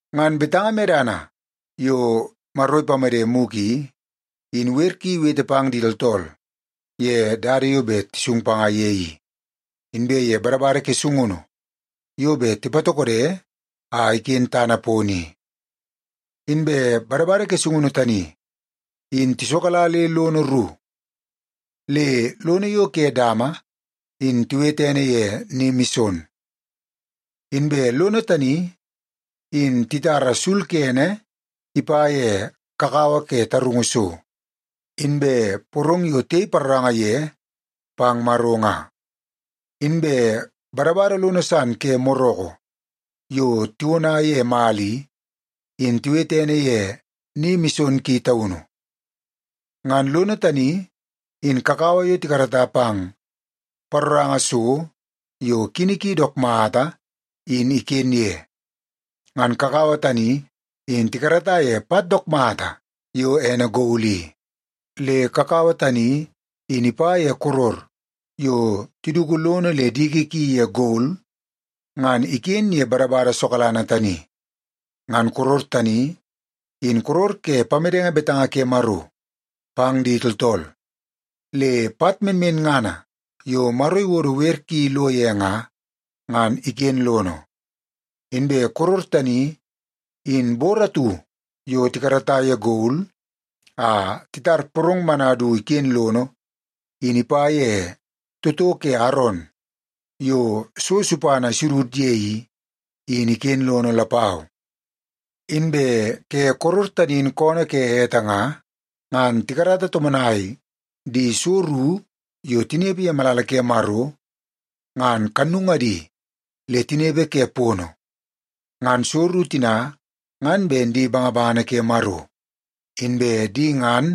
Ngan betanga medana yo Maro ipamede mugu i, in wer ki iwete pang di tooltool ye dada yo bet tisung panga ye i, inbe ye badabada ke sungunu yo bet tipatokodo a iken tana pono i. Inbe badabada ke sungunu tani in tisokala le lono ru. Le lono yo ke dama in tiwete ene ye Ni Mison. Inbe lono tani in titara sul kene ipa ye kakawa ke tarungu so, inbe porong yo tiyei paroranga ye pang Maro nga. Inbe badabada lono san ke moroko yo tiwona ye mala i, in tiwete ene ye Ni Mison Ki Taunu. Ngan lono tani, in kakawa yo tikarata pang paroranga so yo kini ki dook mata, in iken ye. Ngan kakawa tani in tikarata ye pat dook mata yo ene gol i. Le kakawa tani in ipa ye koror yo tiduku lono le diki ki ye gol ngan iken ye badabada sokalanga tani. Ngan koror tani, in koror ke pamedenge betanga ke Maro pang di tooltool, le pat menmenngana yo Maro iwodo wer ki lo ye nga, ngan iken lono. Inbe koror tani, in bor atu yo tikarata ye gol a titar porong mana du iken lono, in ipa ye toto ke Aron yo so supana isudud ye i, in iken lono lapau. Inbe ke koror tani in koonoo ke ete nga, ngan tikarata tomonai di so ru yo tinepe ye malala ke Maro, ngan kannungadi le tinepe ke pono. Ngan so ru tina ngan ben di bangabangana ke Maro, inbe di ngan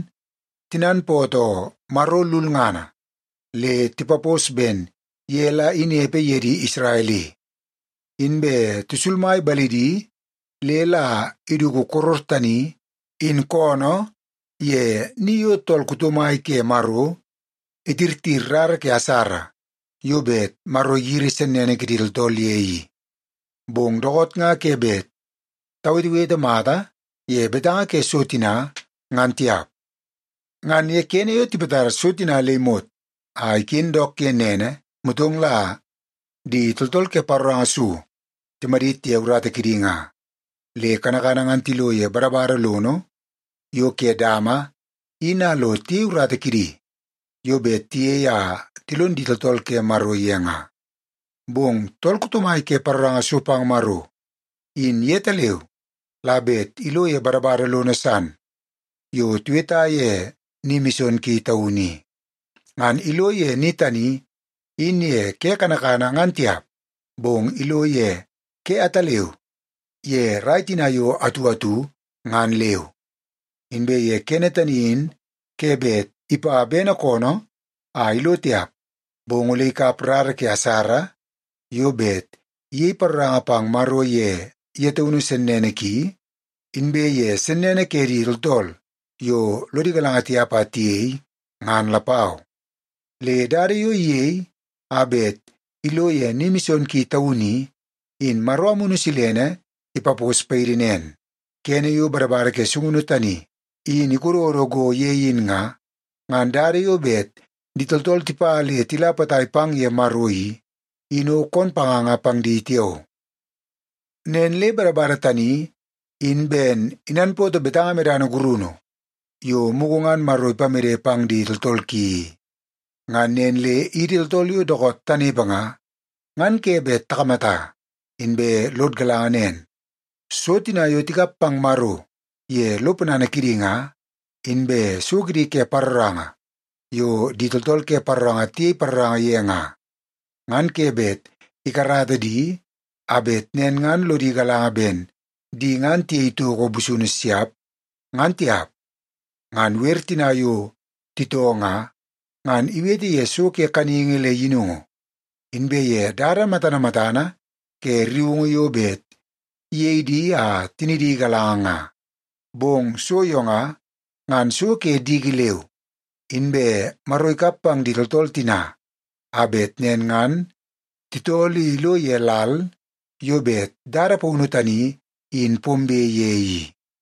tinanpootoo Maro lulngana le tipapos ben ye la inepe ye di Isrel i. Inbe tisulmai balidi le la iduku koror tani in koonoo ye ni yo tool kuto mai ke Maro itirtir rara ke asara yo bet Maro igiri sennene ke di tooltool ye i. Bong dookoot nga ke bet tawetewete mata ye betanga ke so tina, ngan tiap. Ngan ye kene yo tipatar so tina le imot a iken dook ye nene, motong la di tooltool ke paroranga so timadit ye urata kidi nga. Le kanakana ngan tilo ye badabada lono yo ke dama, in a lo tiyei urata kidi yo bet tiyei a tilon di tooltool ke Maro ye nga. Bong tool kuto mai ke paroranga so pang Maro, in yetaleu la bet ilo ye badabada lono san yo tiweta ye Ni Mison Ki Taunu i. Ngan ilo ye ni tani in ye ke kanakana ngan tiap, bong ilo ye ke ataleu ye rai tina yo atu atu ngan leu. Inbe ye kene tani in ke bet ipa bene koonoo a ilo tiap, bong ole ikap rara ke asara yo bet iyei paroranga pang Maro ye ye taunu sennene ki, inbe ye sennene ke di tooltool yo lodi galanga tiap a tiyei, ngan lapau. Le dada yo iyei a bet ilo ye Ni Mison Ki Taunu i, in Maro Amunu Silene ipapos paidi nen: Kene yo badabada ke sungunu tani in ikododo go ye in nga, ngan dada yo bet di tooltool tipa le tila potai pang ye Maro i, in o koon panganga pang di tiao. Nen le badabada tani in ben inanpootoo betanga medana gurunu yo mugu ngan Maro ipamede pang di tooltool ki i. Ngan nen le idi tooltool yo dookoot tanepe nga, ngan ke bet takamata inbe lod galanga nen, so tina yo tikap pang Maro ye lo ponana kidi nga, inbe so kidi ke paroranga yo di tooltool ke paroranga tiyei paroranga ye nga, ngan ke bet ikarata di a bet nen ngan lodi galanga ben di ngan tiyei toko busunu siap, ngan tiap. Ngan wer tina yo titoo nga, ngan iwete ye so ke kaningi le yinungu, inbe ye dada matana matana ke rriungu yo bet iyei di a tinidi igalanga nga. Bong so yo nga, ngan so ke diki leu. Inbe Maro ikap pang di tooltool tina a bet nen ngan titoo le ilo ye lal yo bet dada paunu tani in pombe ye i.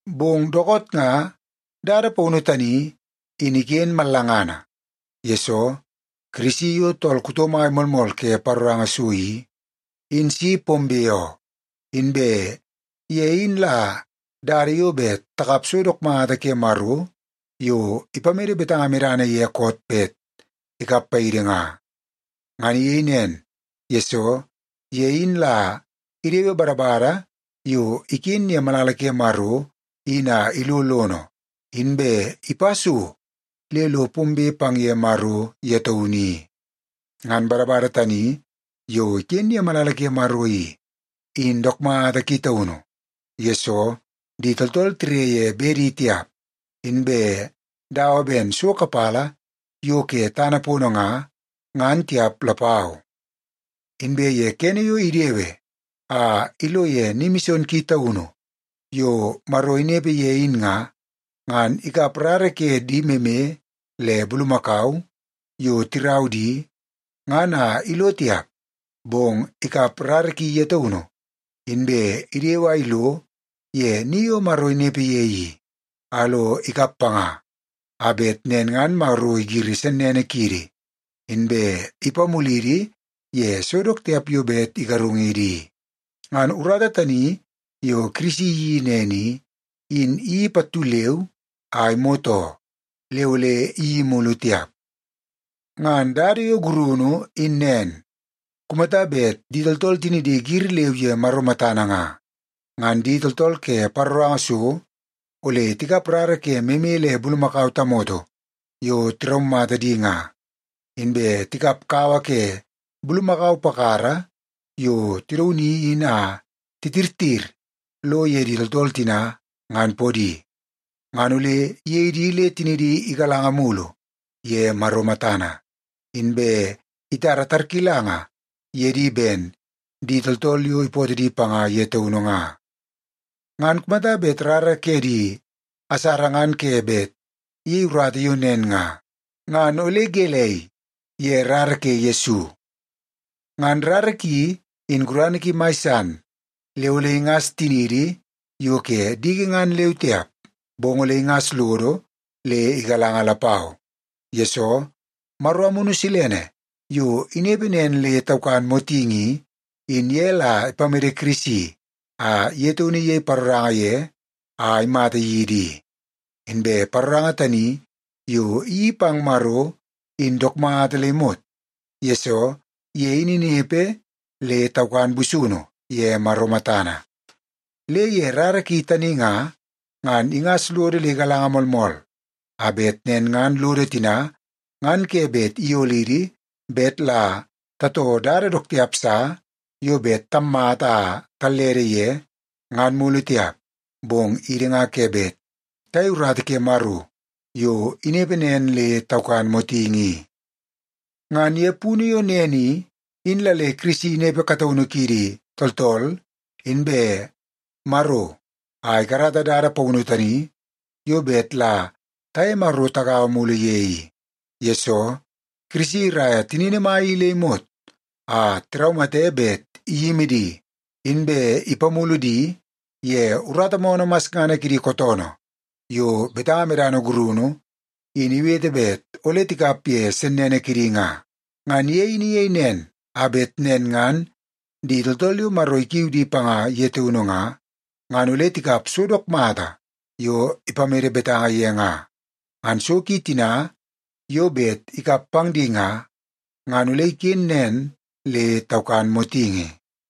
Bong dookoot nga dada paunu tani in iken mallangana, yesoo Kirisi yo tool kuto mai moolmool ke paroranga so i, in si pombe oo. Inbe ye in la dada yo bet takap so dook mata ke Maro yo ipamede betanga medana ye koot bet ikap paidi nga. Ngan iyei nen, yesoo ye in la idewe badabada yo iken ye malala Maro in a ilo lono, inbe ipa so le lo pombe pang ye Maro ye taunu i. Ngan badabada tani yo iken ye malala ke Maro i, in dook mata ki taunu, yesoo di tooltool tire ye bedi tiap, inbe dawa ben so kapala yo ke tana pono nga, ngan tiap lapau. Inbe ye kene yo idewe a ilo ye Ni Mison Ki Taunu yo Maro inepe ye in nga, ngan ikap rara ke di meme le bulumakau, yo tirau di, ngan a ilo tiap. Bong ikap rara ki ye taunu, inbe idewe a ilo ye ni yo Maro inepe ye i, a lo ikap panga, a bet nen ngan Maro igiri sennene kiidi, inbe ipamulidi ye so dook tiap yo bet igarungidi i. Ngan urata tani yo Kirisi iyeii nen i, in iyeii pattu leu a imot oo. Le ole iyeii mulu tiap. Ngan dada yo gurunu in nen. Kumata bet di tooltool tinidi giri leu ye Maro matana nga, ngan di tooltool ke paroranga so ole tikap rara ke meme le bulumakau tamoto yo tiraumata di nga, inbe tikap kawa ke bulumakau pakara yo tidauni in a titirtir lo ye di tooltool tina ngan podi, ngan ole iyei di le tinidi igalanga mulu ye Maro matana, inbe itara tarkilanga ye di ben di tooltool yo ipootoo di panga ye taunu nga. Ngan kumata bet rara ke di asara ngan ke bet iyei urata yo nen nga, ngan ole gelei ye rara ke Yesu? Ngan rara ki in gurana ki mai san le ole ingas tiniidi yo ke diki ngan leu tiap, bong ole ingas lodo le igalanga lapau. Yesoo, Maro Amunu Silene yo inepe nen le taukan motingi i, in ye la ipamede Kirisi a ye taunu iyei paroranga ye a imata yidi i. Inbe paroranga tani yo iyeii pang Maro in dook mata le imot, yesoo ye in inepe le taukan busunu ye Maro matana. Le ye rara ki tani nga, ngan ingas lodo le igalanga moolmool, a bet nen ngan lodo tina ngan ke bet iyolidi bet la tatoo dada dook tiap sa yo bet tammata a tallede ye, ngan mulu tiap, bong idi nga ke bet tayei urata ke Maro yo inepe nen le taukan motingi i. Ngan ye punu yo nen i, in la le Kirisi inepe kataunu kidi tooltool inbe Maro a ikarata dada paunu tani yo bet la tiye Maro tigaua mulu ye i. Yesoo, Kirisi iraia tinini mai i le imot a tiraumate bet iyimi di, inbe ipamulu di ye urata moonoo masngana kidi kootoonoo yo betanga medana gurunu in iwete bet ole tikap ye sennene kidi nga. Ngan ye in iyei nen a bet nen ngan di tooltool yo Maro ikiu di panga ye taunu nga, ngan ole tikap so dook mata yo ipamede betanga ye nga. Ngan so ki tina yo bet ikap pang di nga, ngan ole iken nen le taukan motingi.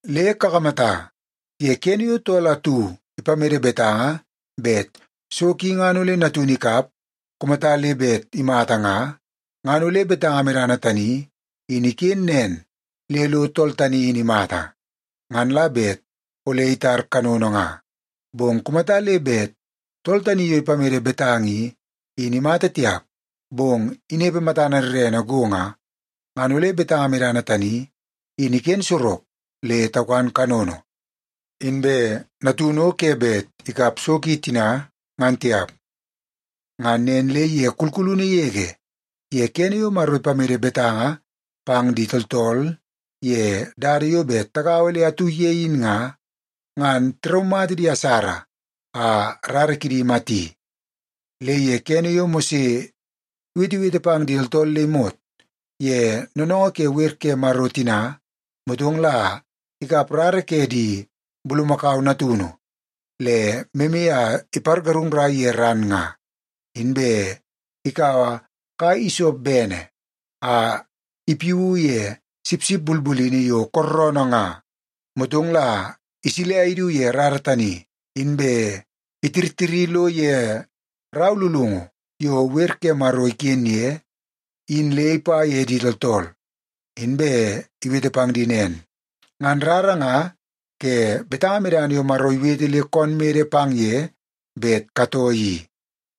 Le kakamata, ye kene yo tool atu ipamede betanga bet so ki ngan ole natunu ikap kumata le bet imata nga, ngan ole betanga medana tani in iken nen le lo tool tani in imata, ngan la bet ole itar kanono nga. Bong kumata le bet tool tani yo ipamede betanga i, in imata tiap, bong inepe matana rrene go nga, ngan ole betanga medana tani in iken sorok le taukan kanono, inbe natunu o ke bet ikap so ki tina ngan tiap. Ngan nen le ye kulkulunu yege ye kene yo Maro ipamede betanga pang di tooltool ye dada yo bet tagaua le atu ye in nga, ngan tiraumata di asara a rara kidi imati. Le ye kene yo Mose iwetewete pang di tooltool le imot ye noonoongoo ke wer ke Maro tina, motong la ikap rara ke di bulumakau natunu le meme a ipargarungnai ye ran nga. Inbe ikaua kai isop bene a ipiu ye sipsip bulbulini yo kooroonoo nga, motong la isilia idu ye rara tani, inbe itirtiri lo ye rau lulungu yo wer ke Maro iken ye in le ipa ye di tooltool, inbe iwete pang di nen, “Ngan rara nga ke betanga medana yo Maro iwete le koon mede pang ye bet katoo i,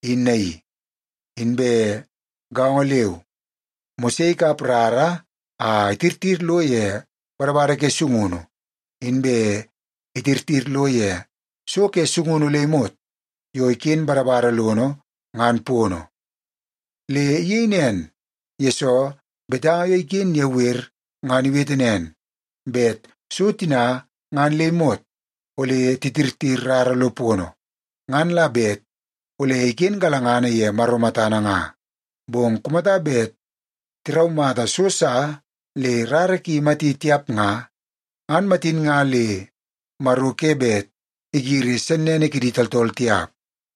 in naii.” Inbe gaongo leu, Mose ikap rara a itirtir lo ye badabada ke sungunu, inbe itirtir lo ye so ke sungunu le imot yo iken badabada lono ngan pono. Le iyei nen, yesoo betanga yo iken ye wer ngan iwete nen, bet so tina ngan le imot ole titirtir rara lo pono, ngan la bet ole iken galangana ye Maro matana nga. Bong kumata bet tiraumata so sa le rara ki imati tiap nga, ngan matin nga le Maro ke bet igiri sennene kidi tooltool tiap.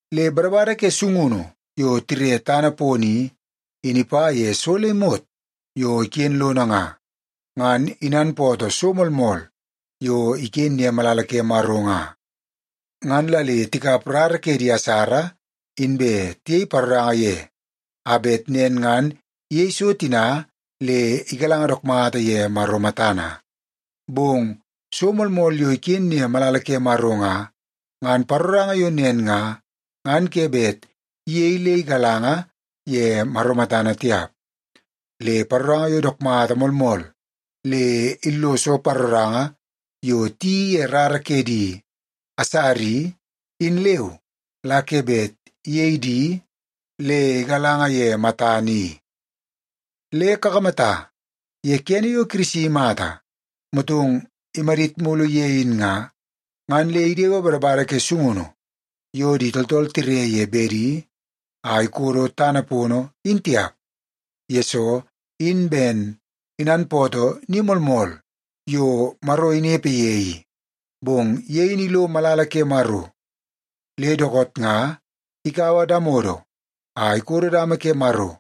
Le badabada ke sungunu yo tire tana pono i, in ipa ye so le imot yo iken lono nga, ngan inanpootoo so moolmool yo iken ye malala ke Maro nga. Ngan la le tikap rara ke di asara, inbe tiyei paroranga ye, a bet nen ngan iyei so tina le igalanga dook mata ye Maro matana. Bong so moolmool yo iken ye malala ke Maro nga, ngan paroranga yo nen nga, ngan ke bet iyei le igalanga ye Maro matana tiap. Le paroranga yo dook mata moolmool le illoso paroranga yo tiyeii ye rara ke di asara i, in leu la ke bet iyei di le igalanga ye matana i. Le kakamata, ye kene yo Kirisi imata motong imadit mulu ye in nga, ngan le idewe badabada ke sungunu yo di tooltool tire ye bedi a ikodo tana pono in tiap, yesoo in ben inanpootoo ni moolmool yo Maro inepe ye i. Bong ye in ilo malala ke Maro, le dookoot nga ikaua damodo a ikodo dama ke Maro,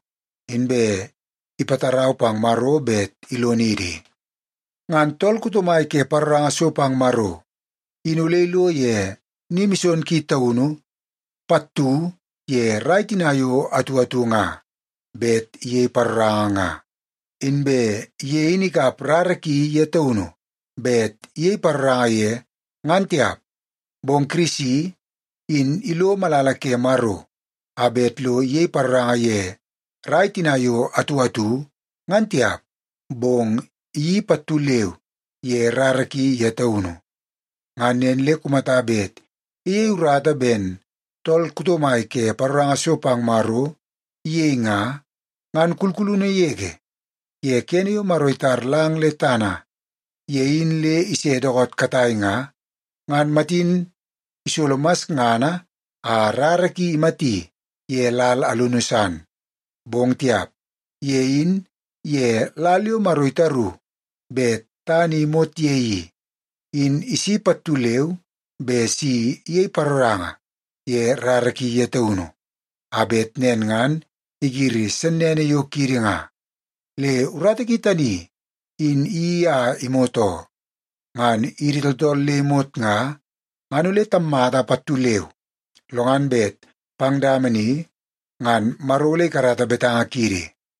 inbe ipatarau pang Maro bet ilonidi. Ngan tool kuto mai ke paroranga so pang Maro in ole ilo ye Ni Mison Ki Taunu pattu ye rai tina yo atu atu nga bet iyei paroranga nga. Inbe ye in ikap rara ki ye taunu bet iyei paroranga ye, ngan tiap. Bong Kirisi, in ilo malala ke Maro a bet lo iyei paroranga ye rai tina yo atu atu, ngan tiap, bong iyeii pattu leu ye rara ki ye taunu. Ngan nen le kumata bet iyei urata ben tool kuto mai ke paroranga so pang Maro iyei nga, ngan kulkulunu yege ye kene yo Maro itar lang le tana ye in le ise dookoot katai nga, ngan matin isolo masngana a rara ki imati ye lal alunu san. Bong tiap! Ye in, ye lal yo Maro itaru bet tana i imot ye i, in isi pattu leu be si iyei paroranga ye rara ki ye taunu, a bet nen ngan igiri sennene yo kiidi nga. Le urata ki tani in iyeii a imot oo. Ngan idi tooltool le imot nga, ngan ole tammata pattu leu, lo ngan bet pang dama ni ngan Maro ole ikarata betanga kiidi.